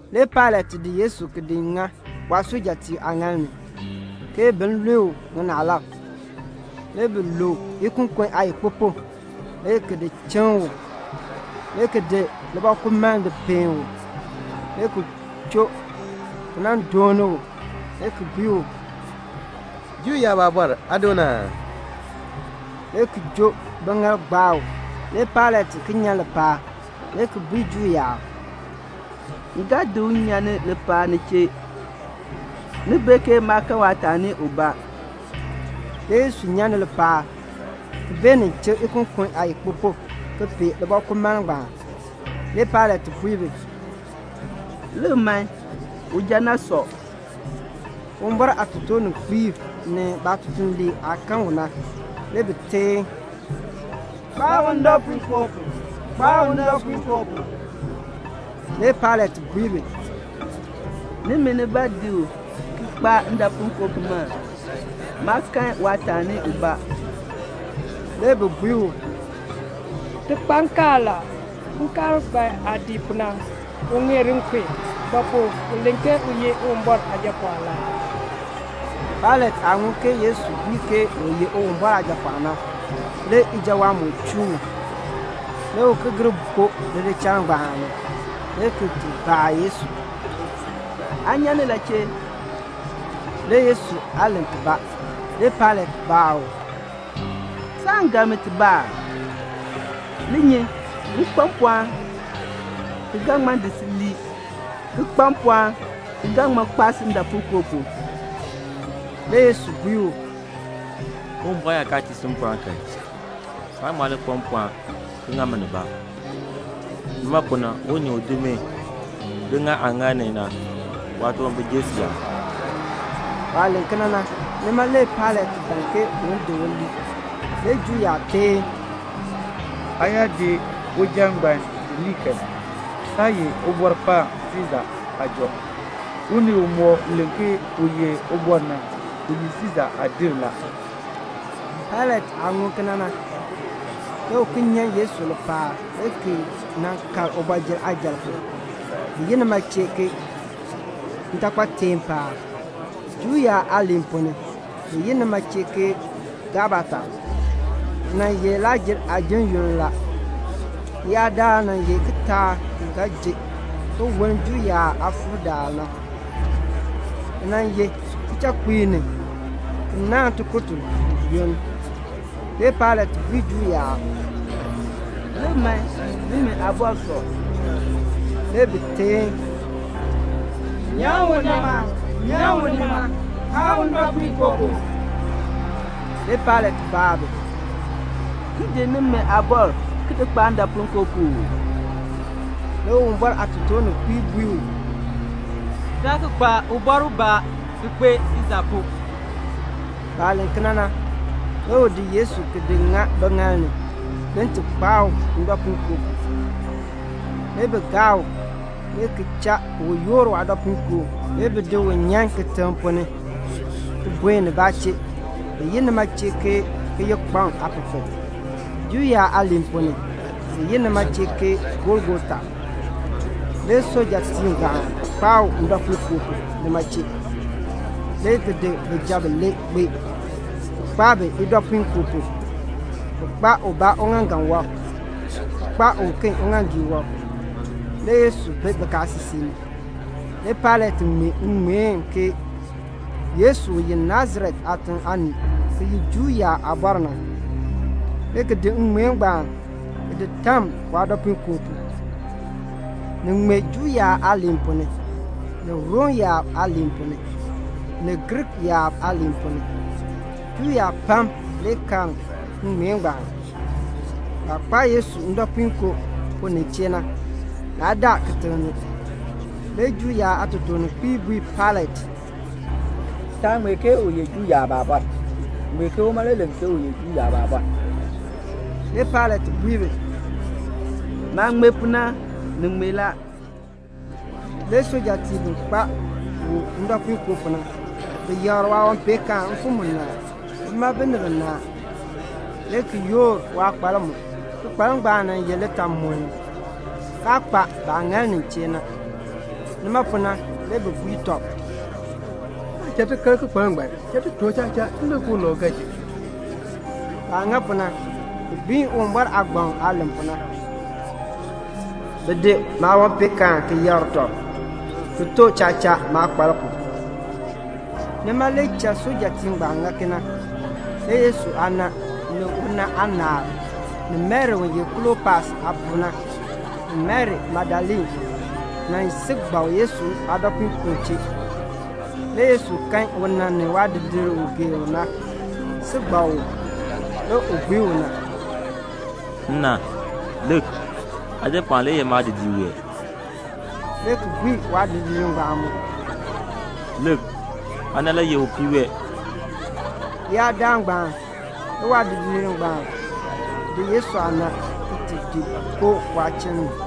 Le Pailat di Yesu ki di ŋa waasujatiib aaŋaal ni, ke bin lue u ŋinaalab. Le bi luu ikokon aayikpupuk le ki di chiŋ u, le ki di libɔkumaln di peen u, le ki choo ki nan dooni u, le ki bui u, "Juu yaab Aabɔr, aa doon aa?" le ki joo biŋaal gbaa u. Le Pailat ki nyan lipaal, le ki bui Juu yaab, "M ga di u nyan lipaal ni chee, ni bee ke maa kan waataani ubaa." Le Yesu nyan ni lipaal, ki beenin chik ikokon aayikpupuk ki pee libɔkumaln ngbaan. Le Pailat bui bi, "Lik man, uja na sɔ." Uwumbɔr aatotoorninkpiib ni baatutuliib aah kan u na, le bi teen, "Kpaa u ndɔpuinkoo pu, kpaa u ndɔpuinkoo pu." Le Pailat bui bi, "Nimi nibaa di u ki kpaa ndɔpuinkoo pu man. Maa kan waataani ubaa." Le bi bui u, "Ti kpa nkaal la. Nkaal ngbaan aah dii pu na, u ŋeer nkun; ba pu? u len ke u ye Uwumbɔr Aajapɔɔn la." Pailat aah ŋun ke Yesu bui ke u ye Uwumbɔr Aajapɔɔn na, le ijawaan moo chuu u. Le u ki gir koo lidichal ngbaan ni, le ki ti baa Yesu, "Aa nyan ni la chee?" Le Yesu aa len tibaa. Le Pailat baa u, "Saan gar mi tibaa aa? Li nyi! M kpa mpɔɔn, ki ga ŋma di si lii, ki kpa mpɔɔn ki ga ŋma kpaa si ndɔpuinkoo pu." Le Yesu bui u, "Uwumbɔr yaa kaa tii si mpɔɔn kan, saan ŋma li kpa mpɔɔn ki ŋa mi nibaa. Nima pu na unii u di mi di ŋa aaŋaal ni na, waatunwambir jer siyaan." Waah len kena na, nima le Pailat ban ke un di u lii; le Juu yaab teen, "Aa yaa di uja ngbaan di lii kan, saa ye Ubɔrkpaan Siisa aajɔ; unii umɔk len ke u ye ubɔr na, u ye Siisa aadin la." Pailat aah ŋun kena na, le u ki nyan Yesu lipaal le ki nan kal ubɔjir aajal pu, bi yi nima chee "Ntaakpateer paab." (Juu yaab aaliin ponn ni, bi yi nima chee ke "Gabata.") Ni nan ye Lakr-jer aajim yoonn la. Leyaadaal nan ye kitaak ki ga ji ki woln Juu yaab aakpakool na. Ni nan ye kichakpiik ni, ki naahn tikur tiluub yoonn. Le Pailat bui Juu yaab, "Lik man, nimi aabɔr sɔ." Le bi teen, "Nyan u nima, nyan u nima, kpaa u ndɔpuinkoo pu." Le Pailat baa bi, "M di nimi aabɔr ki di kpaa ndɔpuinkoo pu uu?" Le Uwumbɔr aatotoorninkpiib bui u, "Taa ki kpa ubɔr ubaa ki kpee Siisa pu." Baah len kena na, le u di Yesu ki di ŋa biŋaal ni, bin ti kpaa u ndɔpuinkoo pu. Le bi gaa u, le ki cha u yoor waadɔpuinkoo, le bi di u nyan kitiŋ ponn ni, ki buen nibaa chee, bi yi nima chee ke "Kiyikpaŋ aapepel." (Juu yaab aaliin ponn ni, bi yi nima chee ke "Golgota.") Le sujatiib ngbaan kpaa u ndɔpuinkoo pu nima chee, le ki di bijab bilee kpee, ki kpaa bi idɔpuinkoo pu. Bi kpaa ubaa uŋaaŋgan wɔb, ki kpaa uken uŋaaŋgii wɔb. Le Yesu bi bikaasisik ni. Le Pailat ŋmee ŋŋmeen ke "Yesu u ye Nasaret aatiŋ aanii, ki ye Juu yaab Aabɔr na," le ki di ŋŋmeen ngbaan ki di tam waadɔpuinkoo pu. Ni ŋmee Juu yaab aaliin ponn ni, ni Rom yaab aaliin ponn ni, ni Griik yaab aaliin ponn ni. Juu yaab pam le karn ŋŋmeen ngbaan; baah kpaa Yesu ndɔpuinkoo pu nin chee na, naa daa kitiŋ ni. Le Juu yaab aatotoorninkpiib bui Pailat, "Taa ŋmee ke u ye Juu yaab Aabɔr. Ŋmeen ke uma le len ke u ye Juu yaab Aabɔr." Le Pailat bui bi, "Maah ŋmee pu na, ni ŋmee la." Le sujatiib bi kpaa u ndɔpuinkoo pu na, bi yakr waawanpeenkaan mfim munaa, bima binib binaa; le ki yoor waakpalk mu. Kikpalk ngbaan nan ye litaamuln, kaa kpa baah ŋal nin chee na. Nima pu na le bi bui tɔb, "Taa cha ti kar kikpalk ngbaan. Cha ti too chacha, ki lik ke ulau ga ji ki." Baah ŋa pu na, ni gbiin Uwumbɔr aagbaŋ aah len pu na: "Bi di maawanpeenkaan ki yakr tɔb, ki too chacha maakpalk pu." Nima le cha sujatiib ngbaan ŋa kena. Le Yesu aana, ni una aanaal, ni Mari u ye Klopas aapuu na, ni Mari Magdalene, nan si gbak Yesu aadɔpuinkoo chee. Le Yesu kan una ni waadidiir u u gee u na, si gbak u. Le u bui una, "Nna, lik, aajapɔɔn le ye maadidiir wee," le ki bui waadidiir ngbaan mu, "Lik, aana le ye upii wee." Leyaadaal ngbaan, le waadidiir ngbaan di Yesu aana, ki ti di koon waachiln ni.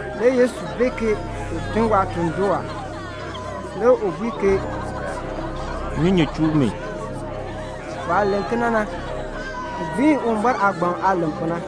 Le Yesu bee ke u tun waatuln doo a. Le u bui ke "Nnyunyun chuu mi." Waah len kena na, ni gbiin Uwumbɔr aagbaŋ aah len pu na.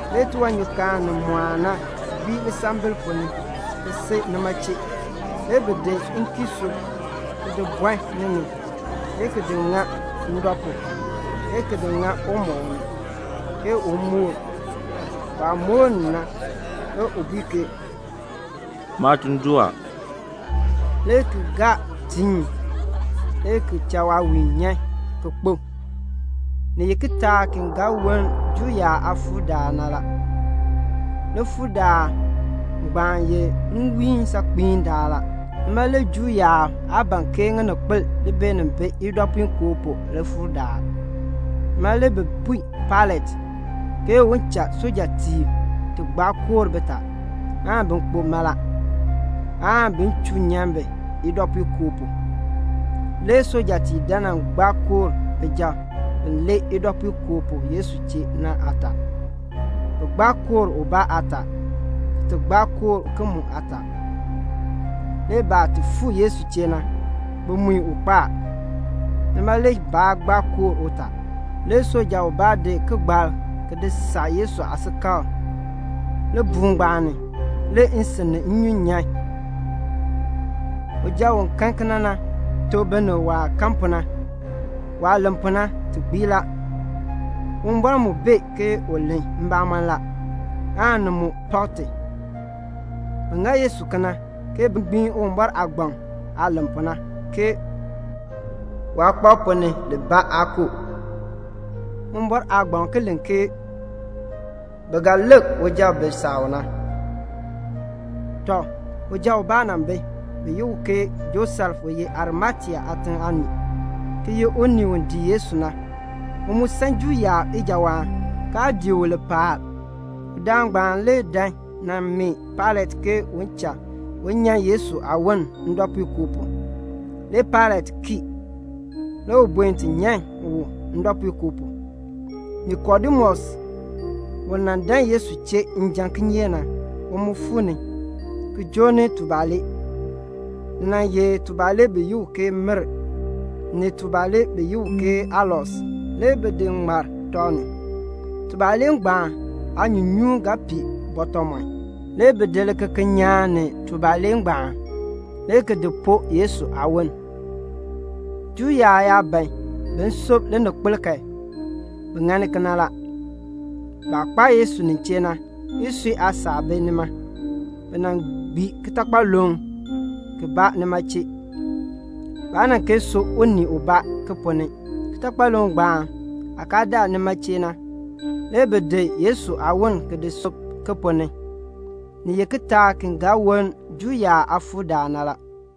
Le tiwanyukaan ni mɔɔn na gbii lisambil ponn ni ki si nima chee. Le bi di nkiisuu ki di bɔn ni ni, le ki di ŋa ndɔ pu, le ki di ŋa umɔb ni, ke un moor. Waah moor ni na, le u bui ke, "Maatuln doo a," le ki gaa tiin, le ki cha waawiin nyan, ki kpo. Ni ye kitaak ki ga woln Juu yaab aakpakool na la. Likpakool ngbaan ye nwiin saakpiin daal la. Nima le Juu yaab aa ban ke ŋininkpol li beenin bi idɔpuinkoo pu likpakool daal. Nima le bi bui Pailat ke un cha waasujatiib ti gbaa koor bitaa, aan bin kpo mala, aan bin chuu nyan bi idɔpuinkoo pu. Le sujatiib dan nan gbaa koor bijab bi lee idɔpuinkoo pu Yesu chee na aataa. Bi gbaa koor ubaa aataa, ki ti gbaa koor uken mu aataa. Le baah ti fuu Yesu chee na, bi mui u kpo a, nima le baa gbaa koor utaa. Le suja ubaa di kigbalk ki di saa Yesu aasikakl. Libuul ngbaan ni, le nsin ni nnyun nyan. (Uja u kan kena na tuk binib waah kan pu na. Waah len pu na, ti gbii la. Uwumbɔr mu bee ke u len mbamɔn la, aan ni mu pak ti.) Bi ŋa Yesu kena, ke bin gbiin Uwumbɔr aagbaŋ aah len pu na, ke "Waakpab ponn ni libaa aan koo." Uwumbɔr aagbaŋ ki len ke "Bi ga lik uja u bi saa u na." Tɔ, uja ubaa nan bi, bi yi u ke Josef u ye Arimatea aatiŋ aanii, ki ye unii u dii Yesu na. U mu san Juu yaab ijawaan, kaa dii u lipaal. Udaan ngbaan le dan nan mee Pailat ke u cha u nyan Yesu aawon ndɔpuinkoo pu. Le Pailat kii. Le u buen ti nyan u ndɔpuinkoo pu. Nikodemus, u nan dan Yesu chee njan kinyeek na, u mu fuu ni, ki joo ni tubalee. Ni nan ye tubalee bi yi u ke mir, ni tubalee bi yi u ke alos, le bi di ŋmar tɔb ni. Tubalee ngbaan aanyuunyuun ga pii bɔtɔmɔn. Le bi di likekeln nyaan ni tubalee ngbaan, le ki di poo Yesu aawon. Juu yaab yaa ban bin sub lininkpol kan, bi ŋani kena la. Baah kpaa Yesu nin chee na, isui aasaak bi nima. Bi nan gbii kitakpaluŋ kibaa nima chee. Baa nan kee sub unii ubaa ki ponn ni. Kitakpaluŋ ngbaan aah kaa daa nima chee na, le bi di Yesu aawon ki di sub ki ponn ni. Ni ye kitaak ki ga woln Juu yaab aakpakool daal na la.